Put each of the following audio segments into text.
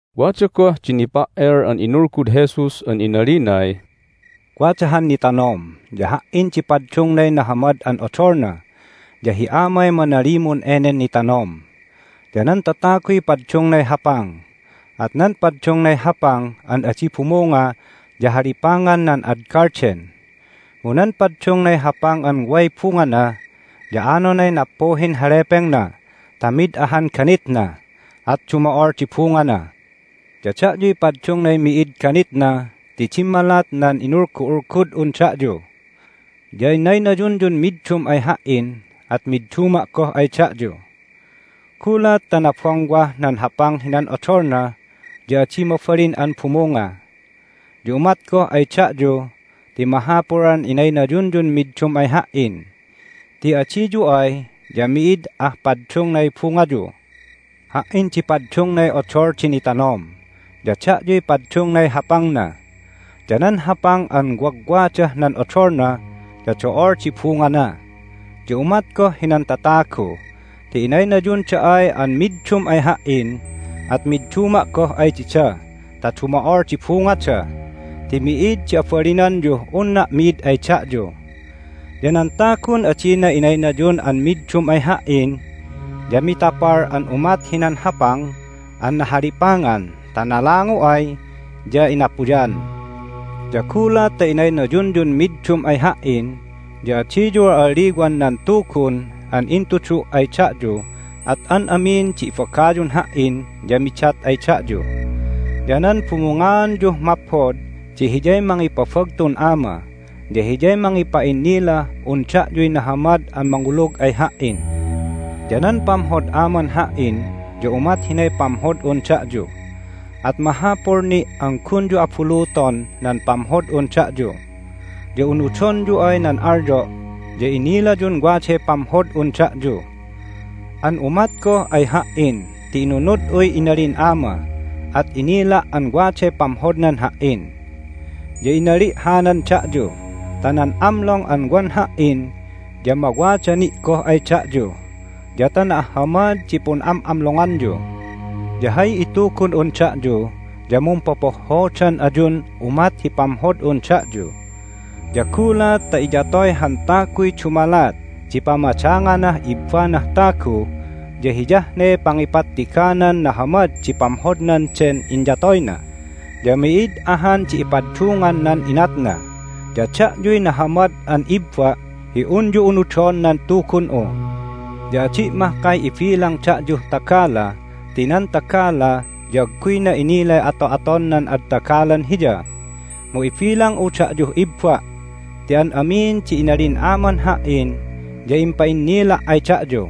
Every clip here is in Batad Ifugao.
Wada goh di nipa"el an inulgud Jesus an inalinay, "Wada han nitanom, ya Ha"in di paddungnay Nahamad an Odolna, ya hi Amay manalimun enen nitanom. Ya nan tataguy paddungnay hapang, at nan paddungnay hapang an adi bumunga ya halipangan nan ad galden. Mu nan paddungnay hapang an way bungana ya anonay nappuhin halepengna ta mid ahan ganitna, at dumo'ol di bungana. Ya da'yuy paddungnay mi'id ganitna ti dimmalat nan inulgu'ulgud'un da'yu. Ya inaynayunyun middum ay Ha"in, at midduma' goh ay da'yu. Gulat ta nabongwah nan hapang hinan odolna ya adi mabalin an bumunga. Ya umat goh ay da'yu ti mahapul an inaynayunyun middum ay Ha"in, ti adiyu ay ya mi'id ah paddungnay bungayu. Ha"in di paddungnay Odol di Nitanom, ya da'yuy paddungnay hapangna. Ya nan hapang an wagwadah nan odolna ya do'ol di bungana. Ya umat goh hinan tatagu ti inaynayunda ay an middum ay Ha"in at midduma' goh ay dida ta dumo'ol di bungada, ti mi'id di abalinanyuh unna' mi'id ay da'yu. Ya nan tagun adina inaynayun an middum ay Ha"in ya mitapal an umat hinan hapang an nahalipangan ta nalangu ay ya inapuyan. Ya gulat ta inaynayunyun middum ay Ha"in ya adiyu al'alliwan nan Tugun an intudu' ay da'yu at an amin di ibagayun Ha"in ya midat ay da'yu. Ya nan bumungaanyuh maphod di hiyay mangipabagtun Ama, ya hiyay mangipa'innilah un da'yuy nahamad an mangulug ay Ha"in. Ya nan pamhod Aman Ha"in ya umat hinay pamhod'un da'yu, at mahapul ni' an gunyu abuluton nan pamhod'un da'yu. Ya unudonyu ay nan alyo' ya innilayun waday pamhod'un da'yu. An umat goh ay Ha"in ti inunud'uy inalin Ama, at inila' an waday pamhodnan Ha"in. Ya inali' hanan da'yu ta nan amlong an wan Ha"in ya mawada ni' goh ay da'yu, ya ta na'ahhamad di pun'am'amlonganyu. Ya hay itugun'un da'yu ya mumpopohhodan ayun umat hi pamhod'un da'yu. Ya gulat ta iyatoy han taguy dumalat di pamadanganah ibbanah tagu ya hiyah ne pangipattiganan nahamad di pamhodnan den inyatoyna, ya mi'id ahan di ipaddungan nan inatna. Ya da'yuy nahamad an ibba' hi unyu unudon nan Tugun'u. Ya adi' mahkay ibilang da'yuh tagala ti nan tagala ya agguyna inilay ato'aton nan ad tagalan hiya. Mu ibilang'u da'yuh ibba' ti an amin di inalin Aman Ha"in ya impa'innila' ay da'yu.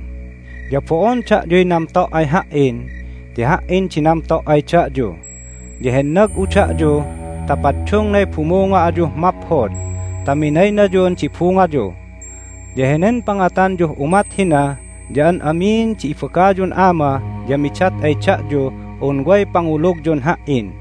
Ya bo'on da'yuy namto' ay Ha"in ti Ha"in di namto' ay da'yu, ya hennag'u da'yu ta paddungnay bumunga ayuh maphod ta minaynayun di bungayu. Ya henen pangatanyuh umat hina ya an amin di ibagayun Ama ya midat ay da'yuh un way pangulugyun Ha"in.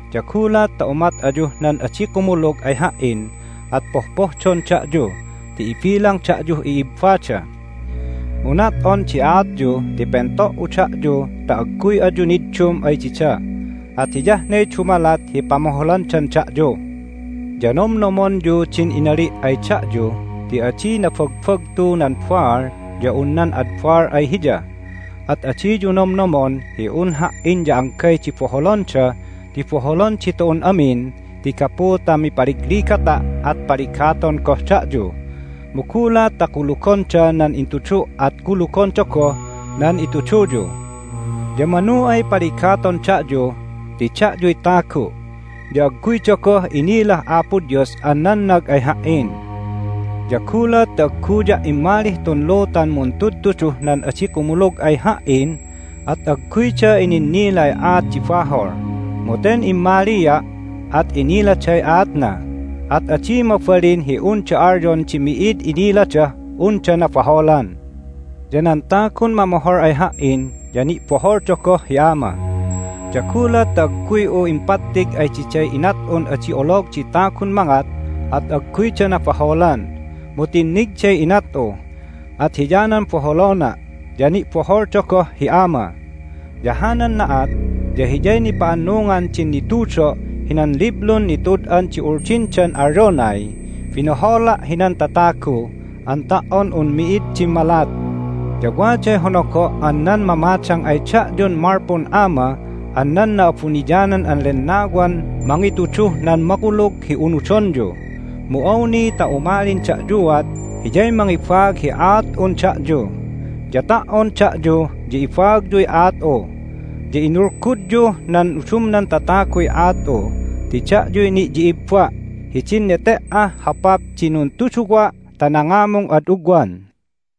Ya gulat ta umat ayuh nan adi kumulug ay Ha"in at pohpohdon da'yu ti ibilang da'yuh i'ibbada. Mu nat'on di aatyu ti pento"u da'yu ta agguy ayu niddum ay dida, at hiyah ne dumalat hi pamoholandan da'yu. Ya nomnomonyu din inali' ay da'yu ti adi nabagbagtu nan baal ya un nan ad baal ay hiya. At adiyu nomnomon hi un Ha"in ya anggay di boholonda ti boholon ditu'un amin ti gapu ta mipaligligata' at paligaton goh da'yu, mu gulat ta kulugonda nan intudu' at kulugonda goh nan ituduyu. Ya manu ay paligaton da'yu ti da'yuy tagu', ya agguyda goh inilah Apo Dios an nannag ay Ha"in. Ya gulat ta agguya' immalih tun lutan muntudtuduh nan adi kumulug ay Ha"in at agguyda ininnilay aat di bahol. Mu ten immalia', at iniladay aatna, at adi mabalin hi unda alyon di mi'id iniladah unda nabaholan. Ya nan tagun mamohol ay Ha"in ya ni'boholda goh hi Ama. Ya gulat ta agguy'u impattig ay diday inat'un adi olog di tagun mangat at agguyda nabaholan. Mu tinnigday inat'u, at hiyanan boholona', ya ni'boholda goh hi Ama. Ya hanan na'at ya hiyay nipa'annungan din nitudo' hinan liblun nitud'an di Uldindan alyonay, Binohola' hinan tatagu an ta"on un mi'id dimmalat. Ya waday honogo' an nan mamadang ay da'yun malpun Ama an nan Na'abuniyanan an Lennawan mangituduh nan makulug hi unudonyu. Mu awni ta umalin da'yuat Hiyay mangibaag hi aat'un da'yu. Ya ta"on da'yu ya ibaagyuy aat'u, ya inulgudyuh nan udumnan tataguy aat'u ti da'yuy ni'yi'ibba' hidin nete"ah hopap di nuntuduwa' ta nangamung ad ugwan."